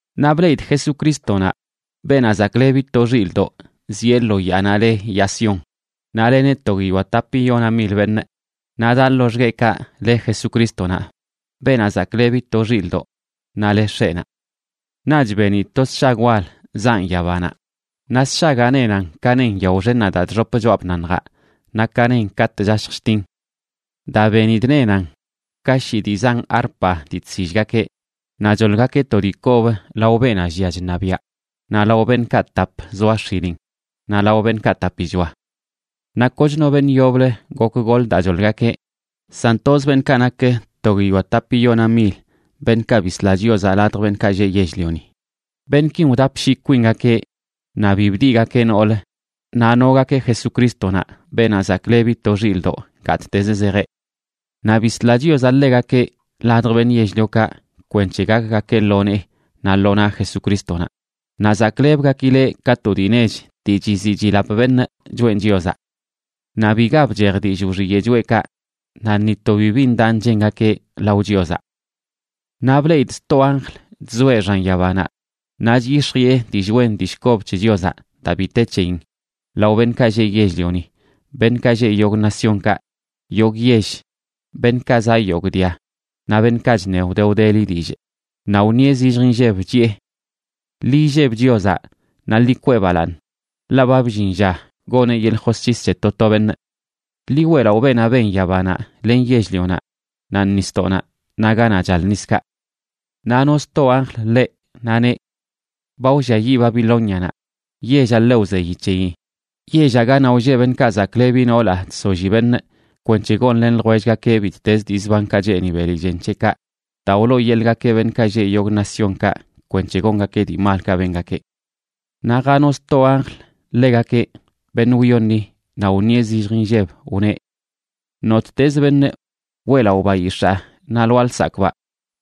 Naꞌ bleꞌidꞌ Jesucrístonaꞌ, Beenaꞌ Zaklebi to Xilꞌdoꞌ, zieꞌ lo yaanaꞌ le yaa Sión. Naꞌ leneꞌ to guiyoa tapiyona mil beṉꞌ, naꞌ daꞌ loxgueꞌkaꞌ le Jesucrístonaꞌ, Beenaꞌ Zaklebi to Xilꞌdoꞌ, naꞌ le X̱eꞌnaꞌ. Naꞌch benidꞌ to sshag wal zaꞌn yabanaꞌ, naꞌ sshagaꞌ nenan ka nen yao xennaꞌ daa chxop choꞌa bnaṉjaꞌ naꞌ ka nen katꞌ chashj chtin. Daa benidꞌ, nenan ka shii dii zan arpa dii chsillgakeꞌ. Naꞌ choḻgakeꞌ to dii kob lao beenaꞌ llia chṉabiꞌa naꞌ lao beṉꞌkaꞌ tap zoa x̱ilin, naꞌ lao beṉꞌkaꞌ tapichoa. Naꞌ koch no beṉꞌ yoblə gok goḻ daa choḻgakeꞌ, san toz beṉꞌkaꞌ nak to guiyoa tapiyona mil, beṉꞌkaꞌ bisla Chiozaꞌ ladj beṉꞌkaꞌ lleꞌ yell-lioni. Beṉꞌkin wdapshii kwingakeꞌ naꞌ bi bdiꞌgakeꞌ nool, naꞌ nogakeꞌ Jesucrístonaꞌ, Beenaꞌ Zaklebi to Xilꞌdoꞌ, gattezə zejeꞌ. Naꞌ bisla Chiozaꞌ ḻegakeꞌ ladj beṉꞌ yell-liokaꞌ kwenc̱he gakgakeꞌ lo nee naꞌ lo naꞌ Jesucrístonaꞌ. Naꞌ zaklebgakileꞌ ka to dii nech dii chiziꞌ chilap beṉꞌ choꞌen Chiozaꞌ. Naꞌ biga bchej dillꞌ wxiyeꞌ choꞌekaꞌ, naꞌ ni to bibi ndaꞌ nchengakeꞌ lao Chiozaꞌ. Naꞌ bleꞌidꞌ sto anjl chzoeꞌ xan yabanaꞌ, naꞌ chyix̱jiꞌe dillꞌ wen dii kob c̱he Chiozaꞌ daa bi te c̱heyin lao beṉꞌkaꞌ lleꞌ yell-lioni, beṉꞌkaꞌ lleꞌ yogꞌ naciónkaꞌ, yogꞌ yell, beṉꞌkaꞌ zaꞌ yogꞌ dia, naꞌ beṉꞌkaꞌ chneꞌ wde wdeli dillꞌ. Naꞌ wṉieꞌ zillj inlleb, chiꞌe: ―Ḻi illeb Chiozaꞌ naꞌ ḻi kwee balaaṉ, ḻaꞌ ba bllin lla goneꞌ yeḻꞌ josc̱his c̱he to to beṉꞌ. Ḻi weꞌlaꞌo beenaꞌ ben yabanaꞌ len yell-lionaꞌ, naꞌ nisdoꞌnaꞌ, naꞌ ganaꞌ chal niskaꞌ. Naꞌ no sto anjl ḻeꞌ, naꞌ neꞌ: ―Ba wlliayiꞌ Babilónianaꞌ, yellaꞌ ḻe wzeyi c̱heyi, yellaꞌ ganaꞌ wlleꞌ beṉꞌkaꞌ zaklebi noolaꞌ chsolli beṉꞌ kwenc̱he gonlen ljwellgakeꞌ bittez dii zbankaꞌ cheeni beli chen c̱heꞌkaꞌ, daa wlooyeḻꞌgakeꞌ beṉꞌkaꞌ lleꞌ yogꞌ naciónkaꞌ kwenc̱he gongakeꞌ dii malkaꞌ bengakeꞌ. Naꞌ jano sto anjl ḻegakeꞌ, beṉꞌ wyoṉi, naꞌ wṉieꞌ zillj inlleb, wneꞌ: ―Nottezə beṉꞌ weꞌlaꞌo bayix̱aa naꞌ lwaa lsakꞌbaꞌ,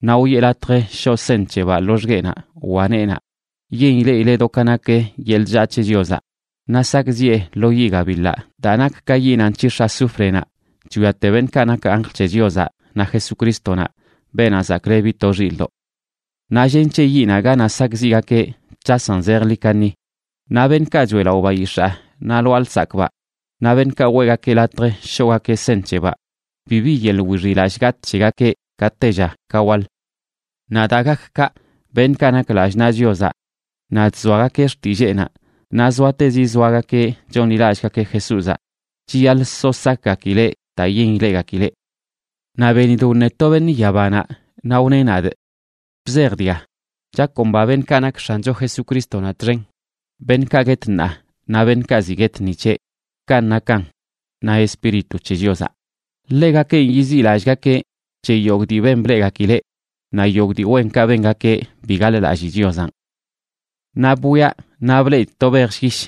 naꞌ wiꞌe latj shoꞌ seṉ c̱hebaꞌ loxgueꞌnaꞌ wa neenaꞌ, yen ileꞌileꞌ do ka nak yeḻꞌ chllaa c̱he Chiozaꞌ. Naꞌ sakꞌziꞌe lo yiꞌ gabiḻaꞌ daa nak ka yinaꞌ nc̱hix̱ azúfrenaꞌ chwiate beṉꞌkaꞌ nak anjl c̱he Chiozaꞌ naꞌ Jesucrístonaꞌ, Beenaꞌ Zaklebi to Xilꞌdoꞌ. Naꞌ llen c̱he yiꞌnaꞌ ganaꞌ sakꞌziꞌgakeꞌ c̱hasan zejḻi kaṉi. Naꞌ beṉꞌkaꞌ choeꞌlaꞌo bayix̱aa naꞌ lwaa lsakꞌbaꞌ naꞌ beṉꞌkaꞌ weꞌgakeꞌ latj shoꞌgakeꞌ seṉ c̱hebaꞌ, bibi yeḻꞌ wixiꞌlallꞌ gatꞌ c̱hegakeꞌ ka tella ka waḻ. Naꞌ daa gak kaꞌ, beṉꞌkaꞌ nak lallꞌ naꞌ Chiozaꞌ naꞌ chzoagakeꞌ xtilleenaꞌ, naꞌ zoatezi zoagakeꞌ chonḻilallꞌgakeꞌ Jesúzaꞌ, chiyaḻꞌ so sakgakileꞌ daa yen ileꞌgakileꞌ. Naꞌ benidꞌ wṉe to beṉꞌ yabanaꞌ, naꞌ wneꞌ nadꞌ: ―Bzej dga: “Chakomba beṉꞌkaꞌ nak X̱ancho Jesucrístonaꞌ txen, beṉꞌkaꞌ guet ṉaa naꞌ beṉꞌkaꞌ ziꞌ guet ni c̱heꞌ.” Kanꞌ nakan, ―na Espíritu c̱he Chiozaꞌ―, ḻegakenꞌ yiziꞌlallꞌgakeꞌ c̱he yogꞌ dii ben bleꞌgakileꞌ, naꞌ yogꞌ dii wenkaꞌ bengakeꞌ bi gaḻ-lallii Chiozanꞌ. Naꞌ bwiaꞌ naꞌ bleꞌidꞌ to bej llyish,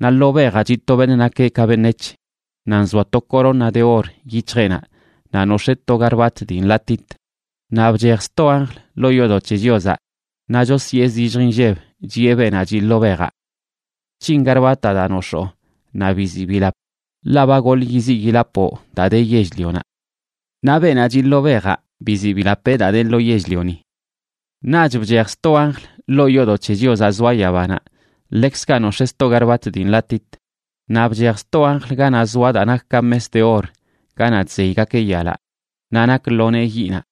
naꞌ lo bejaꞌ chiꞌ to beṉꞌ nakeꞌ ka beṉec̱h. Naꞌ nzoa to corona de or yic̱hjeꞌnaꞌ naꞌ nox̱ee to garbat dii nḻatit. Naꞌ bchej sto anjl ḻoo yoodoꞌ c̱he Chiozaꞌ, naꞌ chosyee zillj inlleb chiꞌe beenaꞌ chiꞌ lo bejaꞌ: ―Bc̱hin garbataꞌ daa nox̱oo naꞌ biziꞌ bilap, ḻaꞌ ba goḻꞌ yiziꞌ yilapoꞌ daa de yell-lionaꞌ. Naꞌ beenaꞌ chiꞌ lo bejaꞌ biziꞌ bilapeꞌ daa de lo yell-lioni. Naꞌch bchej sto anjl ḻoo yoodoꞌ c̱he Chiozaꞌ zoa yabanaꞌ, ḻekzkaꞌ nox̱ee sto garbat dii nḻatit. Naꞌ bchej sto anjl ganaꞌ zoa daa nak ka mes de or ganaꞌ chzeygakeꞌ yalaꞌ, naꞌ nak lo nee yiꞌnaꞌ.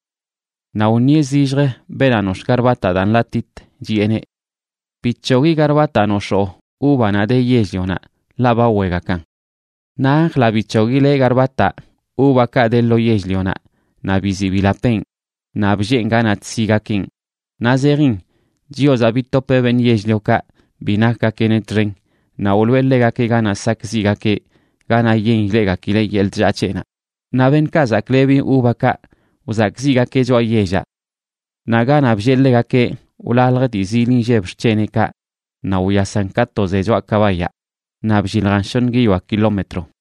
Naꞌ wṉieꞌ zillj beenaꞌ nox̱ꞌ garbataꞌ daa nḻatit, chiꞌeneꞌ: ―Bic̱hogui garbataꞌ nox̱oo uvanaꞌ de yell-lionaꞌ, ḻaꞌ ba wegakan. Naꞌ anjlaꞌ bic̱hoguileꞌ garbataꞌ uvakaꞌ de lo yell-lionaꞌ naꞌ biziꞌ bilapeꞌn, naꞌ blleen ganaꞌ chsigakeꞌn. Naꞌ zejin Chiozaꞌ bitopeꞌ beṉꞌ yell-liokaꞌ bi nakgakeꞌneꞌ txen, naꞌ wloꞌe ḻegakeꞌ ganaꞌ sakꞌziꞌgakeꞌ, ganaꞌ yen ileꞌgakileꞌ yeḻꞌ chllaa c̱heꞌnaꞌ. Naꞌ beṉꞌkaꞌ zaklebi uvakaꞌ, wzakꞌziꞌgakeꞌ choꞌa yellaꞌ. Naꞌ ganaꞌ bllee ḻegakeꞌ wlalj dii zil inlleb xc̱heneꞌkaꞌ naꞌ wyasan ka to ze choꞌa kabayaꞌ naꞌ blliljan shoṉ guiyoa kilómetro.